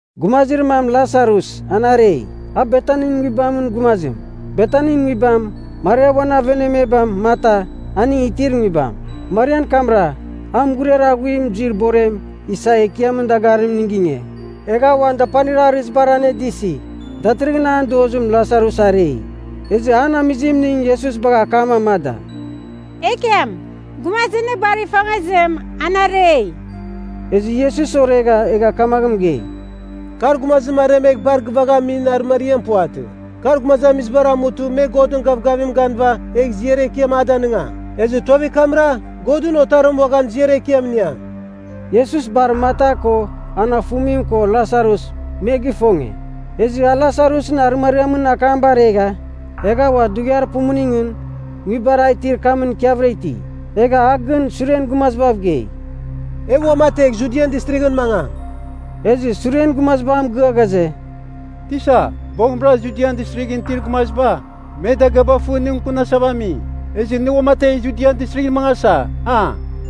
Gumazir mam Lasarus, an arei. A Betanin nguibamɨn gumazim. Betanin nguibam, Maria uan avenamebam Marta aning itir nguibam. (Marian kamra, a mughuriar aghuim zuir borem isa Ekiamɨn dagarimning ginge, egha uan dapanir arɨzibar anedɨsi. Datɨrɨghɨn an dozim Lasarus arei.) Ezɨ an amizimning Iesus bagha akam amada, “Ekiam, gumazir nɨ bar ifongezim, an arei.” Ezɨ Iesus oregha, egha kamaghɨn mɨgei, “Kar gumazim aremegh bar gɨvaghamin arɨmariam puvatɨ. Kar gumazamizibar amutɨ me Godɨn gavgavimɨn ganɨva egh ziar ekiam a danɨngam. Ezɨ tuavir kamra, Godɨn Otarim uaghan ziar ekiam iniam.” Iesus bar Marta ko an afumim ko Lasarus, me gifonge. Ezɨ a Lasarusɨn arɨmariamɨn akam baregha, egha ua dughiar pumuningɨn nguibar a itir kamɨn ikiavɨra iti. Egha a gɨn suren gumazibav gei, “E uamategh Judian Distrighɨn mangam.” Ezɨ suren gumaziba a mɨgɨa ghaze, “Tisa, boghɨmra Judian Distrighɨn itir gumaziba, me dagɨaba fɨ nɨ mɨkɨnasava ami. Ezɨ nɨ uamategh Judian Distrighɨn mangasa, a?”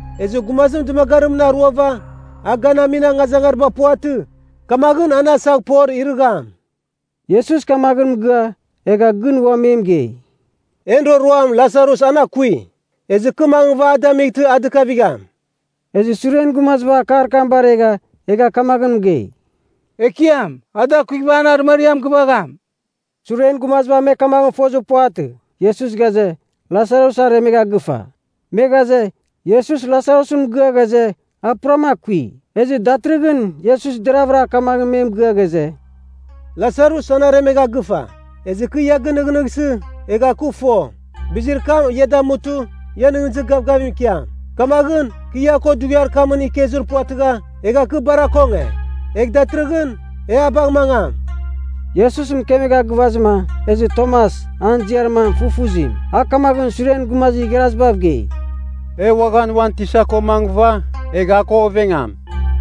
Ezɨ gumazim dɨmagarimɨn aruava, a ganamin angazangariba puvatɨ, kamaghɨn an asaghpor irɨgham.” Iesus kamaghɨn mɨgɨa, egha gɨn ua me mɨgei, “En roroam Lasarus an akui. Ezɨ kɨ mangɨva a damightɨ a dɨkavigham.” Ezɨ suren gumaziba akar kam baregha egha kamaghɨn mɨgei, “Ekiam, a dakuighɨva, an arɨmariam gɨvagham.” Suren gumaziba me kamaghɨn fozir puvatɨ, Iesus ghaze, Lasarus aremegha gɨfa. Me ghaze, Iesus Lasarusɨn mɨgɨa ghaze, a puram akui. Ezɨ datɨrɨghɨn Iesus deravɨra kamaghɨn me mɨgɨa ghaze, “Lasarus an aremegha gɨfa. Ezɨ kɨ ia ginɨghnɨsi, egha kɨ fo, bizir kam ia damutɨ, ia nɨghnɨzir gavgavim ikiam. Kamaghɨn, kɨ a ko dughiar kamɨn ikezir puvatɨgha, egha kɨ bar akonge. Egh datɨrɨghɨn, e a bagh mangam.” Iesus mɨkemegha gɨvazɨma, ezɨ Tomas an ziar mam Fufuzim, a kamaghɨn suren gumazir igharazibav gei, “E uaghan uan Tisa ko mangɨva, egh a ko ovengam.”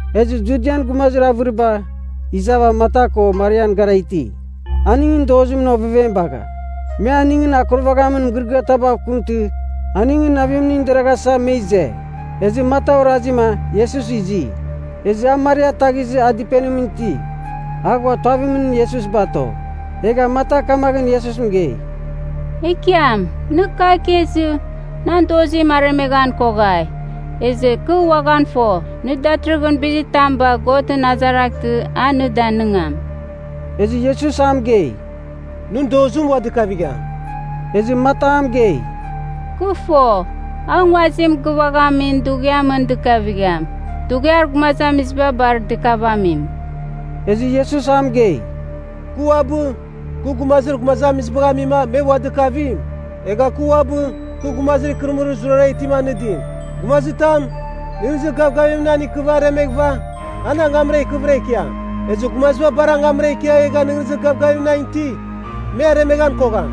Ezɨ Judian gumazamizir avɨriba iza Marta ko Marian gara iti. Aningɨn dozimɨn ovevem bagha, me aningɨn akurvaghamin mɨgɨrɨgɨar tabav kɨmtɨ aningɨn navimning deraghasa, me ize. Ezɨ Marta orazima Iesus izi, ezɨ a Maria ataghizɨ a dɨpenimɨn itima a ghua tuavimɨn Iesus bato. Egha Marta kamaghɨn Iesus mɨgei, “Ekiam, nɨ kagh ikezɨ, nan dozim aremeghan koghai! Ezɨ kɨ uaghan fo, nɨ datɨrɨghɨn bizitam bagh Godɨn azaraghtɨ a nɨ danigam.” Ezɨ Iesus a mɨgei, “Nɨn dozim ua dɨkavigham.” Ezɨ Marta a mɨgei, “Kɨ fo, a nguazim gɨvaghamin dughiamɨn dɨkavigham, dughiar gumazamiziba bar dɨkavamim.” Ezɨ Iesus a mɨgei, “Kɨ uabɨ, kɨ gumazir gumazamizibagh amima me ua dɨkavim, egha kɨ uabɨ, kɨ gumazir ikɨrɨmɨrir zurara itim anɨdim. Gumazitam, nɨghnɨzir gavgavim nan ikɨva aremeghɨva, an angamra ikɨvɨra ikiam. Ezɨ gumaziba bar angamra ikia egha nɨghnɨzir gavgavim nan iti, me aremeghan kogham.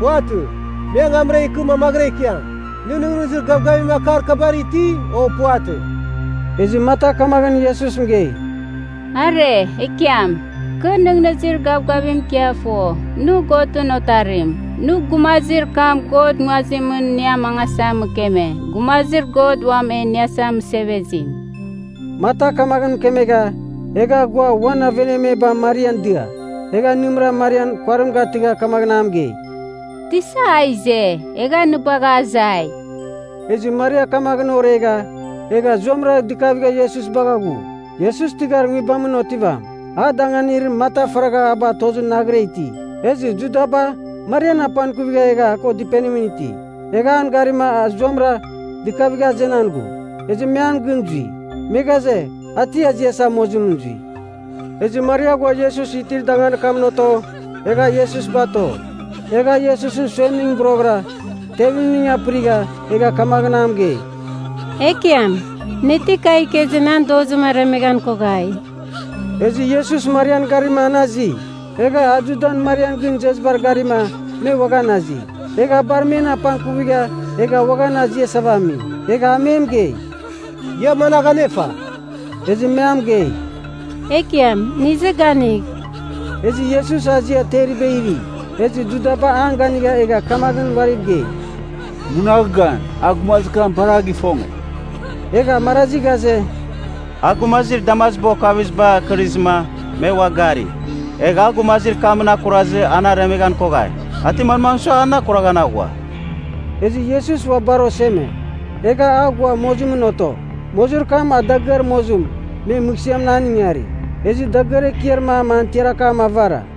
Puvatɨ. Me angamra ikɨ mamaghɨra ikiam. Nɨ nɨghnɨzir gavgavim akar kabar iti, o puvatɨ?” Ezɨ Marta kamaghɨn Iesus mɨgei, “Are, Ekiam! Kɨ nɨghnɨzir gavgavim ikia fo, nɨ Godɨn Otarim. Nɨ gumazir kam God nguazimɨn nɨ amangasa mɨkeme, Gumazir God Uam E Iniasa Mɨsevezim.” Marta kamaghɨn mɨkemegha, egha ghua uan avenamebam Marian dia. Egha nɨmɨra Marian kuarim gatɨgha kamaghɨn a mɨgei, “Tisa a ize, egha nɨ bagha azai.” Ezɨ Maria kamaghɨn oregha, egha zuamɨra dɨkavigha Iesus bagha ghu. (Iesus tɨghar nguibamɨn otivam. A danganir Marta faragha a batozɨ naghɨra iti.) Ezɨ Judaba Marian apangkuvigha egha a ko dɨpenim iti, egha an garima a zuamɨra dɨkavigha azenan ghu. Ezɨ me an gɨn zui. Me ghaze, a ti aziasa mozimɨn zui. Ezɨ Maria ghua Iesus itir danganir kamɨn oto, egha Iesus bato. Egha a Iesusɨn suemningɨn boroghɨra tevimning apɨrigha, egha kamaghɨn a mɨgei, “Ekiam, nɨ ti kagh ikezɨ, nan dozim aremeghan koghai.” Ezɨ Iesus Marian garima an azi. Egha a Judan Marian gɨn izezibar garima me uaghan azi. Egha a bar men apangkuvigha egha uaghan aziasava ami. Egha a me mɨgei, “Ia managh anefa?” Ezɨ me a mɨgei, “Ekiam, nɨ izɨ ganigh.” Ezɨ Iesus azia teriba iri. Ezɨ Judaba an ganigha egha kamaghɨn uariv gei, “Munagh gan. A gumazir kam bar a gifonge.” Egha marazi ghaze, “A gumazir damaziba okaviziba akɨrizɨma me ua gari. Egh a gumazir kamɨn akurazɨ an aremeghan koghai. A ti manmagh sua an akuraghan aghua?” Ezɨ Iesus ua bar oseme, egha a ghua mozimɨn oto. Mozir kam a dagɨar mozim me mɨghsɨamɨn an ingari. Ezɨ dagɨar ekiar mam an tiar akam avara.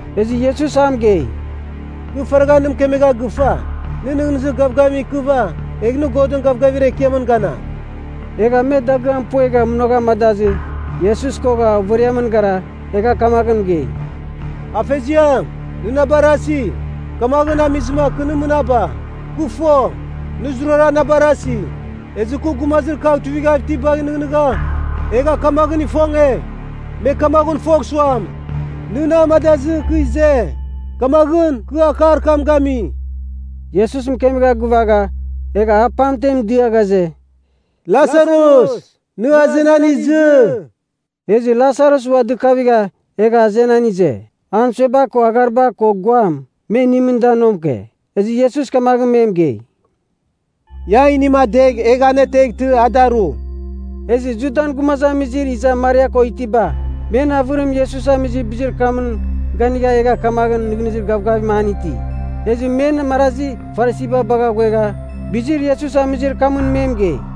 Ezɨ Iesus a mɨgei, “Kɨ faragha nɨ mɨkemegha gɨfa, nɨ nɨghnɨzir gavgavim ikɨva, egh nɨ Godɨn gavgavir ekiamɨn ganam.” Egha me dagɨam puegha munagh amadazɨ, Iesus kogha overiamɨn gara egha kamaghɨn mɨgei, “Afeziam, nɨ na barasi, kamaghɨn amizɨma kɨ nɨ mɨnaba. Kɨ fo, nɨ zurara na barasi. Ezɨ kɨ gumazir kagh tuivighav itibagh nɨghnɨgha, egha kamaghɨn ifonge, me kamaghɨn fogh suam, nɨ na amadazɨ kɨ ize. Kamaghɨn kɨ akar kam gami.” Iesus mɨkemegha gɨvagha, egha a pamtem dɨa ghaze, “Lasarus, nɨ azenan izɨ.” Ezɨ Lasarus ua dɨkavigha egha azenan ize. An sueba ko aghariba ko guam, me inimɨn da nomke. Ezɨ Iesus kamaghɨn me mɨgei, “Ia inim adegh, egh an ateghtɨ, a daru.” Ezɨ Judan gumazamizir iza Maria ko itiba, men avɨrim Iesus amizir bizir kamɨn ganigha egha kamaghɨn nɨghnɨzir gavgavim an iti. Ezɨ men marazi Farisiba bagha ghuegha bizir Iesus amizir kamɨn me mɨgei.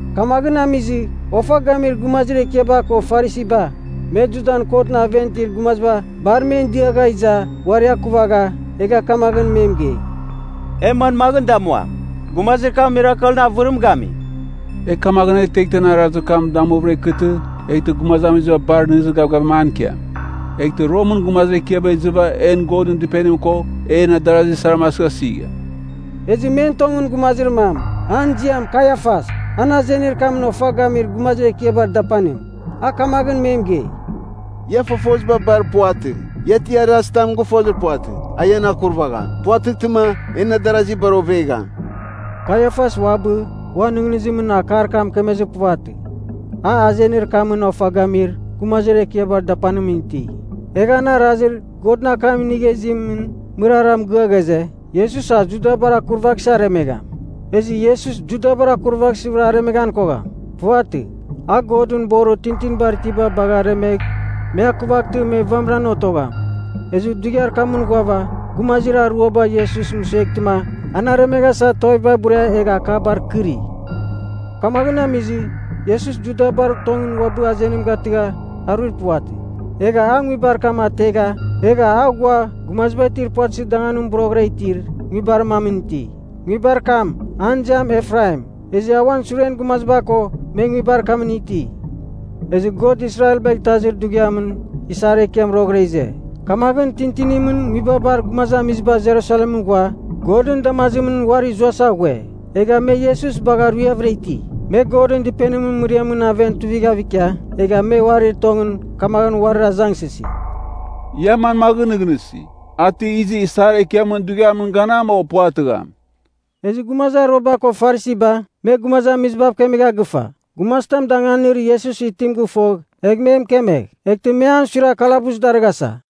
Kamaghɨn amizɨ, ofa gamir gumazir ekiaba ko Farisiba, me Judan kotɨn aven itir gumaziba bar men diagha iza uari akuvagha egha kamaghɨn me mɨgei, “E manmaghɨn damuam? Gumazir kam mirakelɨn avɨrim gami! E kamaghɨn aneteghtɨ an arazir kam damuvɨra ikɨtɨ, eghtɨ gumazamiziba bar nɨghnɨzir gavgavim an ikiam. Eghtɨ Romɨn gumazir ekiaba izɨva en Godɨn Dɨpenim ko en adarasi saram asɨghasigham.” Ezɨ men tongɨn gumazir mam, an ziam Kaiafas, an azenir kamɨn ofa gamir gumazir ekiabar dapanim. A kamaghɨn me mɨgei, “Ia fofoziba bar puvatɨ. Ia ti arazitam gɨfozir puvatɨ, a ian akurvagham. Puvatɨghtɨma, en adarazi bar ovegham.” Kaiafas uabɨ uan nɨghnɨzimɨn akar kam mɨkemezir puvatɨ. A azenir kamɨn ofa gamir gumazir ekiabar dapanimɨn iti. Egha an arazir Godɨn akam inigha izimɨn mɨrara mɨgɨa ghaze, Iesus a Judabar akurvaghsɨ aremegham. Ezɨ Iesus Judabar akurvaghsɨvɨra aremeghan kogham. Puvatɨ. A Godɨn borir tintinibar itiba bagh aremegh me akuvaghtɨ me vamiran otogham. Ezɨ dughiar kamɨn ghuava gumazir aruaba Iesus mɨsueghtɨma an aremeghasa tuaviba buria egha akabar kɨri. Kamaghɨn amizɨ Iesus Judabar tongɨn uabɨ azenim gatɨgha aruir puvatɨ. Egha a nguibar kam ategha egha a ghua gumaziba itir puvatɨzir danganim boroghɨra itir nguibar mamɨn iti. Nguibar kam, an ziam Efraim. Ezɨ a uan suren gumaziba ko, me nguibar kamɨn iti. Ezɨ God Israelbagh Itazir Dughiamɨn isar ekiam roghɨra ize. Kamaghɨn tintinimɨn nguibabar gumazamiziba Jerusalemɨn ghua, Godɨn damazimɨn uari zuasa ghue. Egha me Iesus bagha ruiavɨra iti. Me Godɨn Dɨpenimɨn mɨriamɨn aven tuivighav ikia, egha me uarir tongɨn kamaghɨn uarir azangsɨsi, “Ia manmaghɨn nɨghnɨsi? A ti izɨ isar ekiamɨn dughiamɨn ganam, o puvatɨgham?” Ezɨ gumazir aruaba ko Farisiba me gumazamizibav kemegha gɨfa, gumazitam danganir Iesus itim gɨfogh, egh me mɨkemegh. Eghtɨ me an suiragh kalabus darɨghasa.